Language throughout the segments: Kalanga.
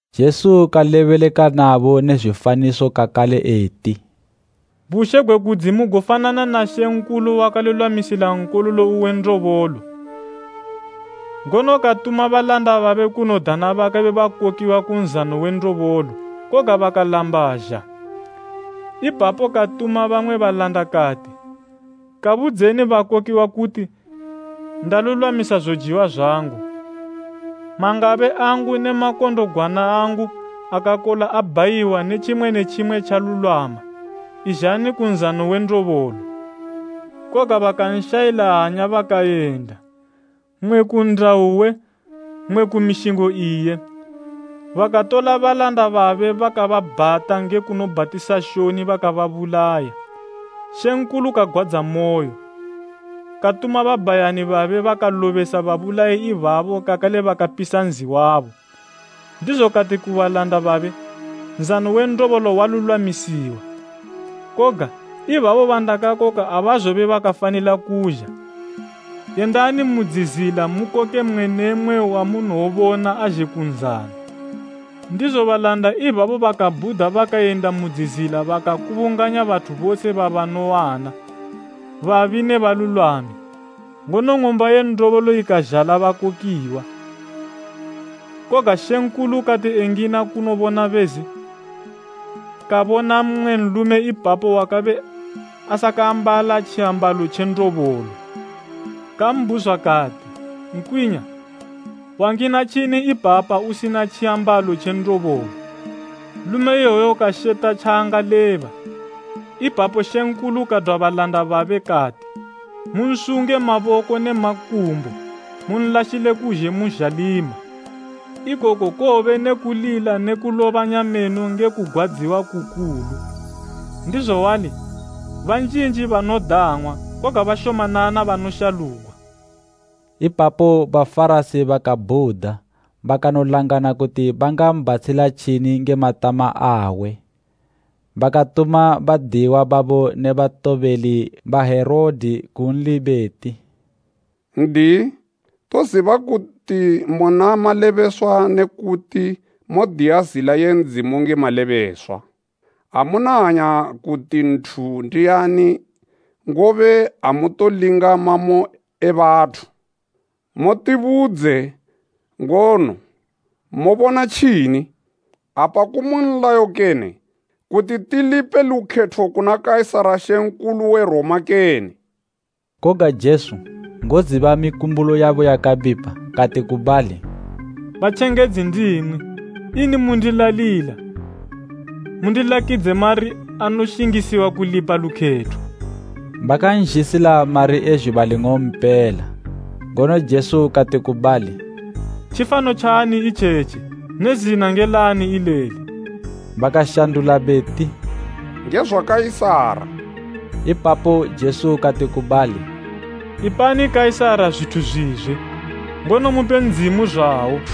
Jesu kalebeleka nabo ne zwifaniso kakale eti, “Bushe gwe kudzimu gofanana na mambo wakalulwamisila nkololo uwe ndobolo. Ngono katuma balanda babe kunodana bakabe bakokiwa ku nzano we ndobolo, koga bakalamba zha. Ipapo katuma bamwe balanda kati, ‘Kabudzeni bakakokiwa kuti, ndalulwamisa zojiwa zwangu, mangabe angu ne makondogwana angu akakola abhayiwa ne tjimwe ne tjimwe tjalulwama. Izhani ku nzano we ndobolo!’ Koga bakanshayila hanya bakayenda, mmwe ku nnda uwe, mmwe ku mishingo iye, bakatola balanda babe bakababhata nge kunobhatisa shoni bakababulaya. Mambo kagwadzamoyo, katuma babhayani babe bakalobesa babulayi ibabo kakale kapisa nzi wabo. Ndizo kati ku balanda babe, ‘Nzano we ndobolo walulwamisiwa, koga ibabo bandakakoka abazobe bakafanila kuzha. Yendani mu dzizila mukoke mmwe ne mmwe wamunowobona azhe ku nzano.’ Ndizo balanda ibabo bakabhuda bakayenda mu dzizila bakakubunganya bathu bose babanowana, babi ne balulwami, ngono ng'umba ye ndobolo ikazhala bakokiwa. “Koga mambo kati engina kunobona bezi, kabona mmwe nlume ipapo wakabe asakaambala tjiambalo tje ndobolo. Kambhuzwa kati, ‘Nkwinya, wangina tjini ipapa usina tjiambalo tje ndobolo?’ Nlume iwoyo kasheta tjaangaleba. Ipapo mambo kadwa balanda babe kati, ‘Munsunge maboko ne makumbo munlashile kuzhe mu zhalima. Ikoko kowobe ne kulila ne kulobanya meno nge kugwadziwa kukulu.’ Ndizo wali, banjinji banodang'wa, koga bashomanana banoshalugwa.” Ipapo Bafarasi bakabhuda bakanolangana kuti bangambhatshila tjini nge matama awe. Bakatuma badiyiwa babo ne batobeli ba Herode kunli beti, “N'diyi, toziba kuti muna malebeswa ne kuti modiya zila ye Ndzimu nge malebeswa. Amuna hanya kuti nthu ndiani ngobe amutolinga mamo e bathu. Mutibudze ngono, mobona tjini? Apa kumu nlayo kene, kuti tilipe lukhetho kuna Kaisara mambo we Roma, kene?” Koga Jesu, ngoziba mikumbulo yabo yakabipa, kati ku bali, “Batjengedzi ndimwi, ini mundilalila? Mundilakidze mari anoshingisiwa kulipa lukhetho.” Bakanzhisila mari e zhuba ling'ompela, ngono Jesu kati ku bali, “Tjifano tjaani itjetji ne zina nge laani ileli?” Bakashandula beti, “Nge zwa Kaisara.” Ipapo Jesu kati ku bali, “Ipani Kaisara zwithu zwizwe, ngono mupe Ndzimu zwawo.”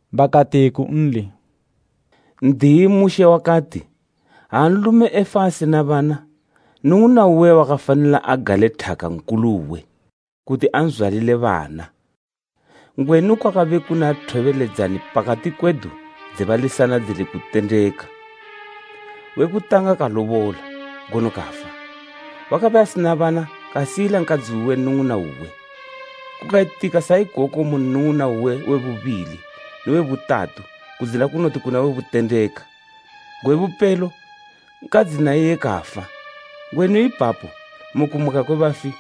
Bakati kunli, “N'diyi, Mushe wakati, ‘Ha nlume efa asina bana, nnung'una uwe wakafanila agale thaka nkulu uwe, kuti anzwalile bana.’ Ngwenu kwakabe kuna thobeledzani pakati kwedu dze balisana dzili kutendeka. We kutanga kalobola, ngono kafa. Wakabe asina bana kasiyila nkadzi uwe nnung'una uwe. Kukayitika sa ikoko mu nnung'una uwe we bubili ne we butatu kudzina kunoti kuna we butendeka. Gwe bupelo, nkadzi na iye kafa. Ngwenu ipapo mu kumuka kwe bafi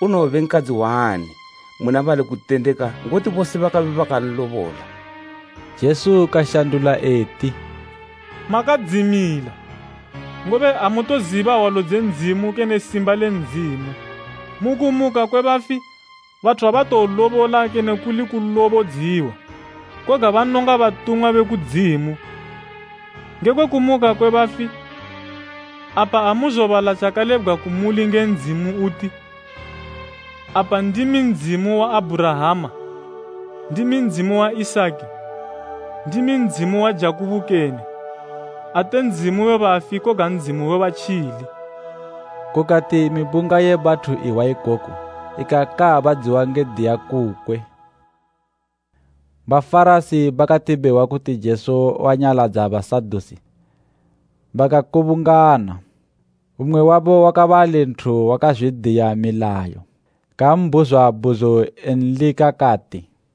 unowobe nkadzi waani muna bali kutendeka ngoti bose bakabe banlobola?” Jesu kashandula eti, “Makadzimila, ngobe amutoziba hwalo dze Ndzimu kene simba le Ndzimu. Mu kumuka kwe bafi, bathu abatolobola kene kuli kulobodziwa. Koga banonga batumwa be kudzimu. Ngekwe kumuka kwe bafi, apa amuzobala tjakalebgwa kumuli nge Ndzimu uti, ‘Apa ndimi Ndzimu wa Abhurahama, ndimi Ndzimu wa Isaki, ndimi Ndzimu wa Jakubo kene?’ Ate Ndzimu we bafi koga Ndzimu we batjili.” Kukati mibunga ye bathu ihwa ikoku ikakaabadziwa nge kudiya kukwe. Bafarasi bakati behwa kuti Jesu wanyaladza Basadusi bakakubungana. Mmwe wabo, wakabe ali nthu wakazwidiya milayo, kambhuzwa bhuzo enlika, kati,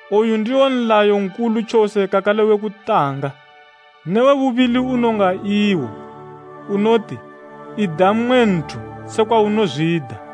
Oyu ndiwo nlayo nkulu tjose kakale we kutanga. Ne we bubili unonga iwo, unoti, ‘Ida mmwe nthu sekwa unozwida.’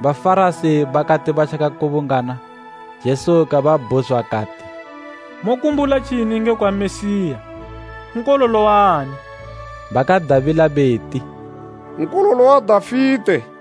Bafarasi bakati batjakakubungana, Jesu kababhuzwa kati, “Mokumbula tjini ngekwa Mesiya? Nkololo waani?” Bakadabila beti, “Nkololo wa Dafite.”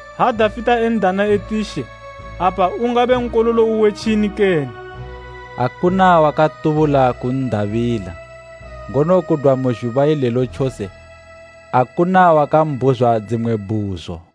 “Ha Dafite en'dana eti ‘She,’ apa ungabe nkololo uwe tjini kene?” Akuna wakatubula kun'dabila, ngono kudwa mu zhuba ilelo tjose akuna wakambhuzwa dzimwe bhuzo.